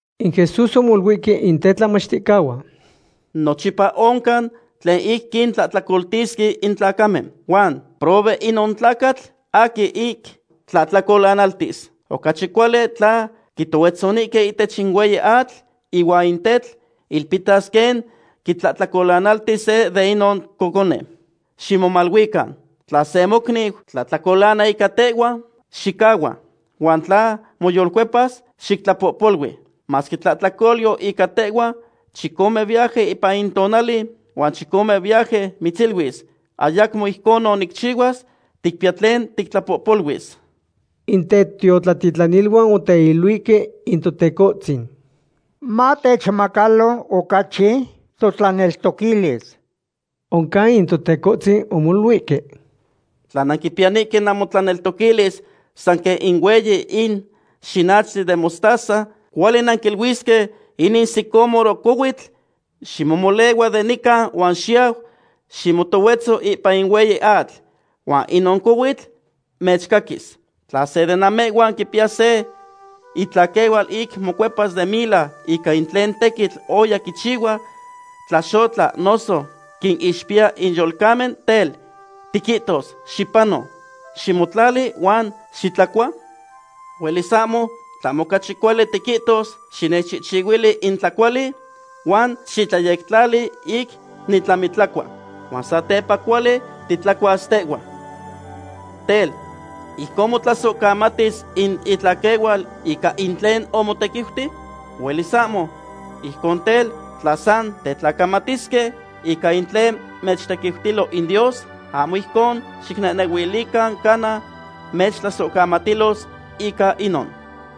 In Jesús omoluihque in tetlamachticahuan: ―Nochipa oncan tlen ic quintlahtlacoltis in tlacamen. Huan ¡prohue inon tlacatl aquin ic tlahtlacolanaltis! Ocachi cuali tla quitohuetzonihque ihtech in hueyi atl ihuan in tetl ilpihtas quen quitlahtlacolanalti se de inon cocone. Ximomaluican. ’Tla se mocniu tlahtlacolana ica tehhua, xicahhua, huan tla moyolcuepas, xictlapohpolui. Masque tlahtlacolyo ica tehhua chicomen viaje ipan in tonali, huan chicomen viaje mitziluis: “Ayacmo ijconon nicchihuas”, ticpiya tlen tictlapohpoluis. In tetiotlatitlaniluan oteiluihque in Totecohtzin: ―Matechmacalo ocachi totlaneltoquilis. Oncan in Totecohtzin omoluihque: ―Tla nanquipiyanihque namotlaneltoquilis san quen ic hueyi in xinachtli den mostaza, cuali nanquiluisque inin sicómoro cohuitl: “Ximomolehua de nican huan xiyau ximotohuetzo ipan in hueyi atl”, huan inon cohuitl mechcaquis. ’Tla se de namehhuan quipiya se itlaquehual ic mocuepas den mila ica in tlen tequitl oya quichihua, tlaxotla noso quinixpiya in yolcamen, tel, ¿tiquihtos: “Xipano, ximotlali, huan xitlacua”? Huelis ahmo, tlahmo ocachi cuali tiquihtos: “Xinechchihchihuili in tlacuali huan xiyectlayectlali ic nitlamitlacua. Huan satepa cuali titlacuas tehhua.” Tel, ¿ijcon motlasohcamatis in itlaquehual ica in tlen omotequiuti? Huelis ahmo. Ijcon tel, tla san tetlacamatisque ica in tlen mechtequiutilo in Dios, ahmo ijcon xicnehnehuilican cana mechtlasohcamatilos ica inon.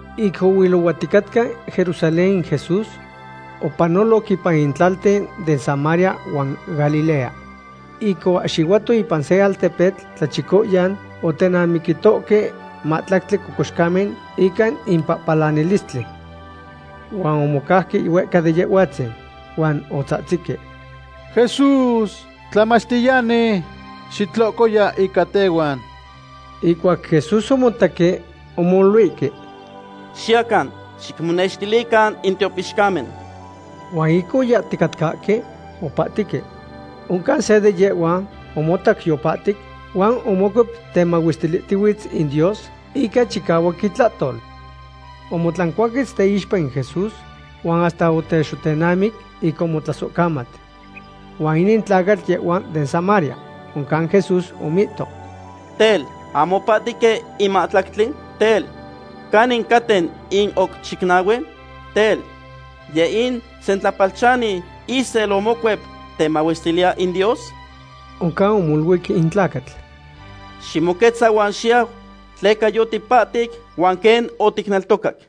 Ic ohuilohuaticatca Jerusalén in Jesús, opanoloc ipan in tlalten den Samaria huan Galilea. Ic oahxihuato ipan se altepetl tlachicoyan, otenamiquitoque mahtlactli cocoxcamen ica in pahpalanilistli. Huan omocauque huehca de Yehhuatzin. Huan otzahtzihque: ―¡Jesús, Tlamachtiyani, xitlocoya ica tehhuan! Ihcuac Jesús omotaque, omoluihque: ―Xiyacan, xicmonextilican in tiopixcamen. Huan ic oyahticatcahque, opahtihque. Oncan se de yehhuan omotac yopahtic, huan omocuep temahuestilihtihuitz in Dios ica chicahuac itlahtol. Omotlancuaquetz teixpa in Jesús, huan hasta otexotenamic, ic omotlasohcamat. Huan inin tlacatl yehhua den Samaria. Oncan Jesús omihto: ―Tel, ¿ahmo opahtihque in mahtlactli? Tel, ¿canin caten in oc chicnahue? Tel, ¿yeh in sentlapalchani isel omocuep temahuestiliya in Dios? Oncan omoluic in tlacatl: ―Ximoquetza huan xiyau tleca yotipahtic huan quen oticneltocac.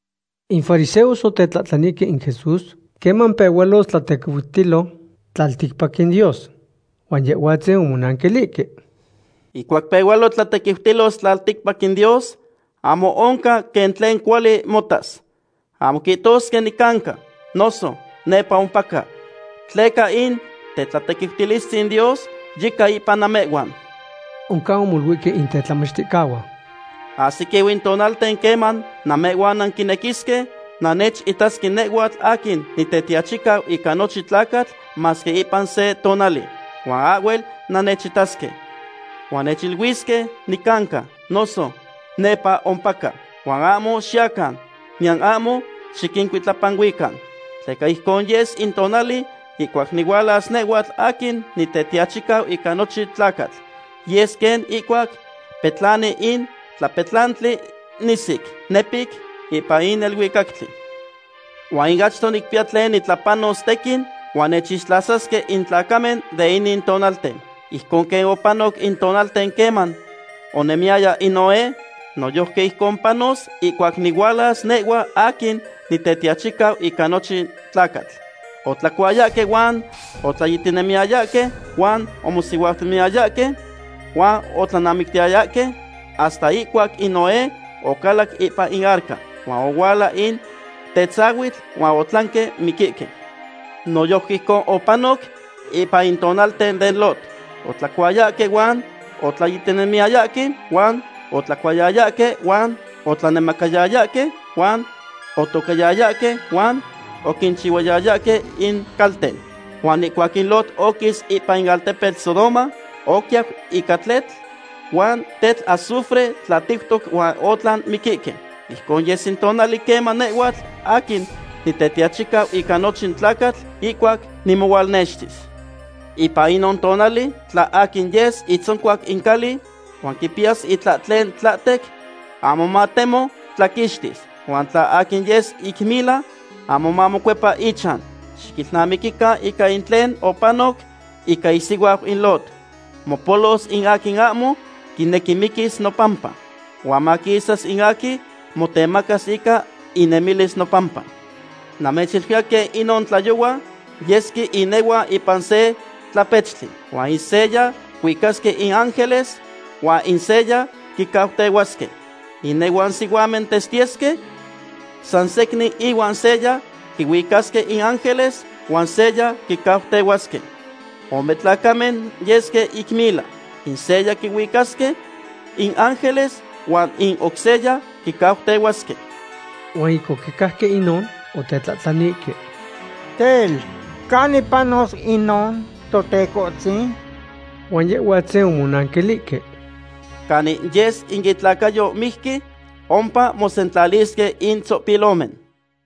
In fariseos otetlahtlanihque in Jesús queman pehualos tlatequiutilo tlalticpac in Dios. Huan Yehhuatzin omonanquilihque: ―Ihcuac pehualo tlatequiutilos tlalticpac in Dios, ahmo oncan quen tlen cuali motas. Ahmo quihtosque: “Nicanca”, nos “Nepa ompaca”; tleca in tetlatequiutilistzin Dios yica ipan namehhuan. Oncan omoluihque in tetlamachticahuan: ―Ahsiquiu in tonalten queman namehhuan nanquinequisque nannechitasque nehhuatl aquin Nitetiachicau ica nochin tlacatl masque ipan se tonali, huan ahhuel nannechitasque. Huan mechiluisque: “Nicanca”, noso “Nepa ompaca.” Huan ahmo xiyacan, niyan ahmo xiquincuitlapanuican. Tleca ijcon yes in tonali ihcuac nihualas nehhuatl aquin Nitetiachicau ica nochin tlacatl. Yes quen ihcuac petlani in tlapetlantli nisic, nepic, ipan in neluicactli. Huan achto nicpiya tlen nitlapanos tequin, huan nechixtlasasque in tlacamen den inin tonalten. Ijcon quen opanoc in tonalten queman onemiyaya in Noé, noyojqui ijcon panos ihcuac nihualas nehhua aquin Nitetiachicau ica nochin tlacatl. Otlacuayahque huan otlayitinemiyayahque, huan omosihuautiyayahque huan otlanamictiyayahque hasta ihcuac in Noé ocalac ipan in arca. Huan ohuala in tetzahuitl huan otlanque miquihque. Noyojqui ijcon opanoc ipan in tonalten den Lot. Otlacuayahque huan otlayitinemiyayahque, huan otlacohuayayahque huan otlanemacayayahque, huan otocayayahque huan oquinchihchihuayayahque in calten. Huan ihcuac in Lot oquis ipan in altepetl Sodoma, oquiyau ica tletl huan tetl azufre tlatiutoc huan otlan miquihque. Ijcon yes in tonali queman nehhuatl aquin Nitetiachicau ica nochin tlacatl ihcuac nimohualnextis. ’Ipan inon tonali, tla aquin yes itzoncuac in cali huan quipiyas itlahtlen tlahtec, ahmo matemo tlaquixtis. Huan tla aquin yes ic mila, ahmo mamocuepa ichan. Xiquilnamiquican ica in tlen opanoc ica isihuau in Lot. Mopolos in aquin ahmo quinequi miquis nopampa, huan maquisas in aquin motemacas ica inemilis nopampa. ’Namechiluiya quen inon tlayohua yesque inehuan ipan se tlapechtli. Huan in seya quihuicasque in ángeles huan in seya quicautehuasque. Inehuan sihuamen testiyesque san secnin huan seya quihuicasque in ángeles huan seya quicautehuasque. Ome tlacamen yesque ic mila. In seya quihuicasque in ángeles huan in oc seya quicautehuasque. Huan ic oquicajque inon, otetlahtlanihque: ―Tel, ¿canin panos inon, Totecohtzin? Huan Yehhuatzin omonanquilihque: ―Canin yes in itlacayo mijqui, ompa mosentlalisque in tzopilomen.